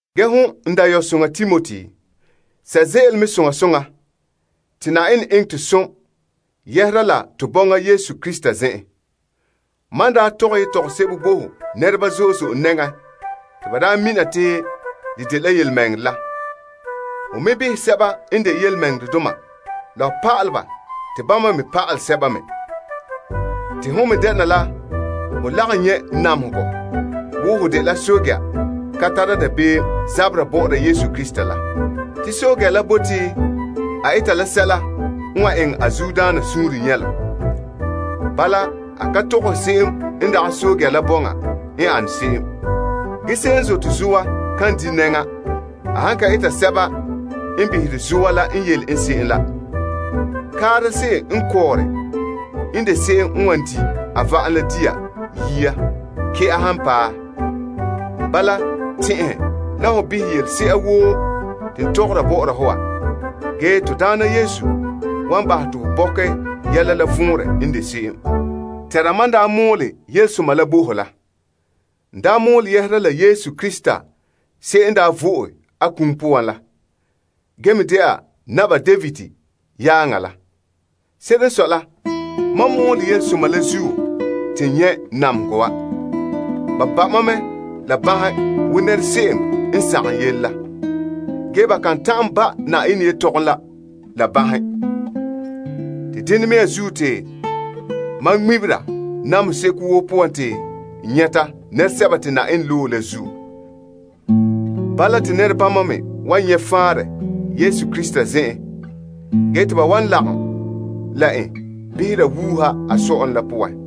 Ge hon n dayɔsoŋa Timoti, sɛ' ze'ele mɛ soŋa soŋa la Yenɛ zo'ohogɔ te bɔna Krista Yesu zen'en. Mam n daa tɔgɛ yetɔgom sebo bo ho nɛreba zo'e zo'e nɛŋa te ba daa mina te dela yelemɛŋɛrɛ la, ho me behɛ sɛba n de yelemɛŋɛrɛdoma, la ho pa'alɛ ba te bama me pa'alɛ sɛba me. Te hon me denɛ la ho lagom nyɛ' namehegɔ wo ho dela pɛɛntɛɛnra ka tara dabeem zabera bɔ'ɔra Yesu Krista la. Te pɛɛntɛɛnra la bote a eta la sɛla n wan eŋɛ a zuodaana suunre nyɛlom. Bala, a ka tɔgɔhe se'em n dagɛ pɛɛntɛɛnra la bɔŋa n ane se'em. Ge se'em n zote zoa kan di' nɛŋa a han ka eta sɛba n behere zoa la n yele en se'em la. Kaara se'em n kɔɔre n de se'em n wan di' a va'am la dia yia kɛ'a han paɛ. Bala, tɛn'ɛhɛ la ho behɛ yelese'a woo te n tɔgɔra bɔ'ɔra ho wa. Ge Na'ayenɛ wan bahɛ te ho bɔkɛ yɛla la vɔnrɛ n de se'em. Tɛnra mam n daa mɔɔlɛ Yelesoma la bo ho la. N daa mɔɔlɛ yɛhera la Yesu Krista se'em n daa vo'e a kum poan la, ge me dɛna Naba David yaaŋa la. Se'ere n sɔe la, mam mɔɔlɛ yelesoma la zuo te n nyɛ' namehegɔ wa. Ge ba ba' mam la banhe wo nɛra se'em n sagom yele la. Ge, ba kan ta'an ba' Yenɛ yetɔgom la banhe. Te dena mea zuo te mam ŋmebera namehe seko woo poan nɛresɛba te Yenɛ loe la zuo. Bala te ba me wan nyɛ' faanrɛ Yesu Krista zen'en ge te ba wan lagom la en behera wuuha a sɔ'ɔlom la poan.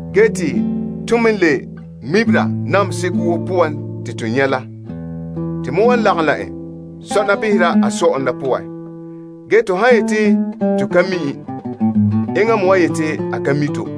Ge te ton me n le ŋmebera namehe seko woo poan te to nyɛ' la, to me wan lagom la en sɔna behera a sɔ'ɔlom la poan. Ge, to han yeti to ka mi' en, enŋa me wan yeti a ka mi' to.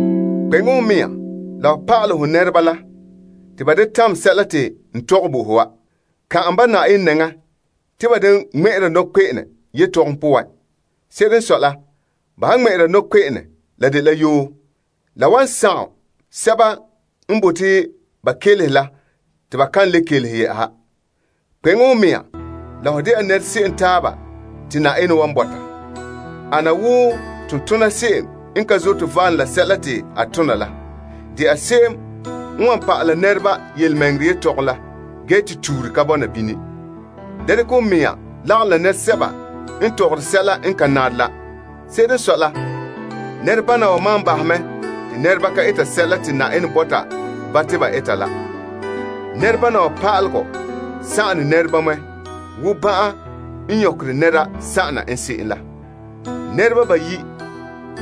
Kpeŋe ho mɛŋa la ho pa'alɛ ho nɛreba la te ba da tamɛ sɛla te n tɔgɛ bo ho wa. Kan'an ba Na'ayenɛ nɛŋa te ba da ŋmɛ'ɛra nɔkpe'ene yetɔgom poan. Se'ere n sɔe la, ba han ŋmɛ'ɛra nɔkpe'ene, la dela yoo. Ge, la wan sagom sɛba n bote ba kelehe la te ba kan le kelehe yɛ'ɛha. Kpeŋe ho mɛŋa la ho dɛna nɛra se'em taaba te Yenɛ wan bɔta. Ana wo tontona se'em n ka zote valom la sɛla te a tona la. De'a se'em n wan pa'ala nɛreba yelemɛŋɛrɛ yetɔgom la ge te tuure ka bɔna bini. Da dekɛ ho mɛŋa lagom la nɛresɛba n tɔgɔre sɛla n ka nare la. Se'ere n sɔe la, nɛrebana wa maan baha mɛ te nɛreba ka eta sɛla te Yenɛ bɔta ba te ba eta la. Nɛrebana wa pa'alegɔ sagone nɛra mɛ wo ban'an n nyɔkɛ nɛra sagona n se'em la. Ge, nɛreba ba yi'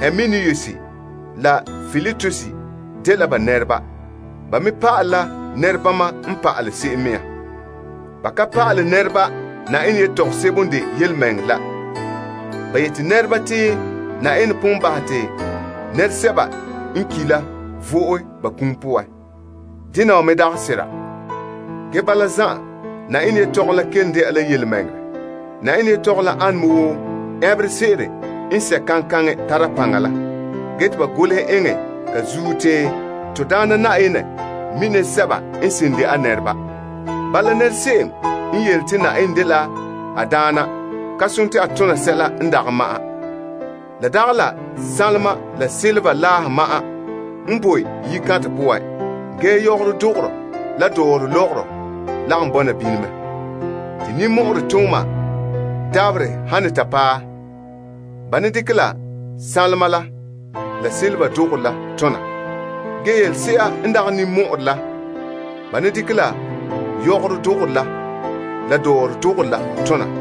Himenaeus la Piletus dela ba nɛreba. Ba me pa'ale la nɛrebama n pa'ale se'em mea. Ba ka pa'ale nɛreba Yenɛ yetɔgom sebo n de yelemɛŋɛrɛ la. Ba yeti nɛreba te Yenɛ pon bahɛ te nɛresɛba n ki' la vo'e ba kum poan. Dena wa me dagɛ sera. Ge bala zan'an, Yenɛ yetɔgom la kelom dɛna la yelemɛŋɛrɛ. Yetɔgom la ane me wo ɛnberɛ se'ere n sɛ' kaŋkaŋɛ n tare paŋa la zuo. Ge te ba golehɛ eŋɛ ka zuo te, Na'ayenɛ wan pa'alɛ sɛba n de a nɛreba. Ge, nɛra se'em n yele te Na'ayenɛ yu'urɛ ka sontii a bahɛ be'em. La dagɛ la sanlema la sanlenpeela laahe ma'an n boe yikantɛ poan. Ge, yɔgɔrɔ dogorɔ la dɔrɔlɔgɔrɔ lagom bɔna bini mɛ. Te ninmɔ'ɔrɛ tooma dabaherɛ han ne ta paɛ, ba ne dekɛ la sanlema la, la sanlenpeela dogorɔ la tona. Ge, yelese'a n dagɛ ninmɔ'ɔrɛ la, ba ne dekɛ la yɔgɔrɔ dogorɔ la dɔrɔlɔgɔrɔ la tona.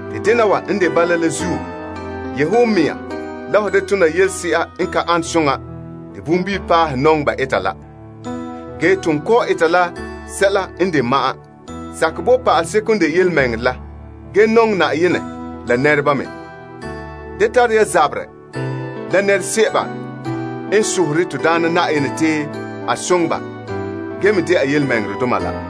Te dena wa n de bala la zuo, yehe ho mɛŋa la ho da tona yelese'a n ka ane soŋa te bonbilipaalehe nɔŋɛ ba eta la. Ge, ton kɔ'ɔn eta la sɛla n de ma'an. Sakɛ bo pa'aleseko n de yelemɛŋɛrɛ la ge nɔŋɛ Yenɛ la nɛreba me. Dene ya boyena la nɛresɛba n sohore to Daana te a soŋɛ ba ge me dɛna yelemɛŋɛrɛdoma la.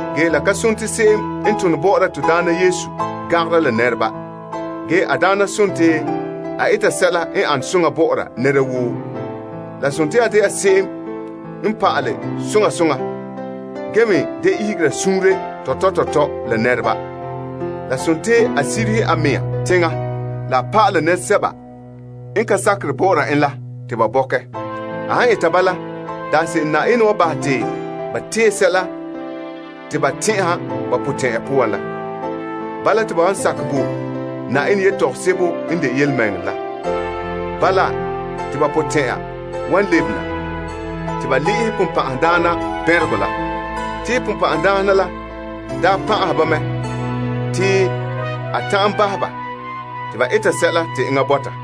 Ge la ka sontii se'em n tone bɔ'ɔra Na'ayenɛ gangara la nɛreba. Ge, a daana sontii a eta sɛla n ane soŋa bɔ'ɔra nɛra woo. La sontii a de'a se'em n pa'alɛ soŋa soŋa ge me da ihegera suunre tɔtɔ tɔtɔ la nɛreba. La sontii a sirihe a mea teŋa la a pa'alɛ nɛresɛba n ka sakere bɔ'ɔra en la te ba bɔkɛ. A han eta bala, daanse'ere Yenɛ wan bahɛ te ba tee sɛla te ba tɛn'ɛha ba potɛn'ya poan la. Bala, te ba wan sakɛ bo Yenɛ yetɔgom sebo n de yelemɛŋɛrɛ la. Bala, te ba potɛn'ya wan lebe na te ba le'ehɛ Sagona bɛnreka la. Te Sagona la daa pan'ahɛ ba mɛ te a ta'an bahɛ ba te ba eta sɛla te eŋɛ bɔta.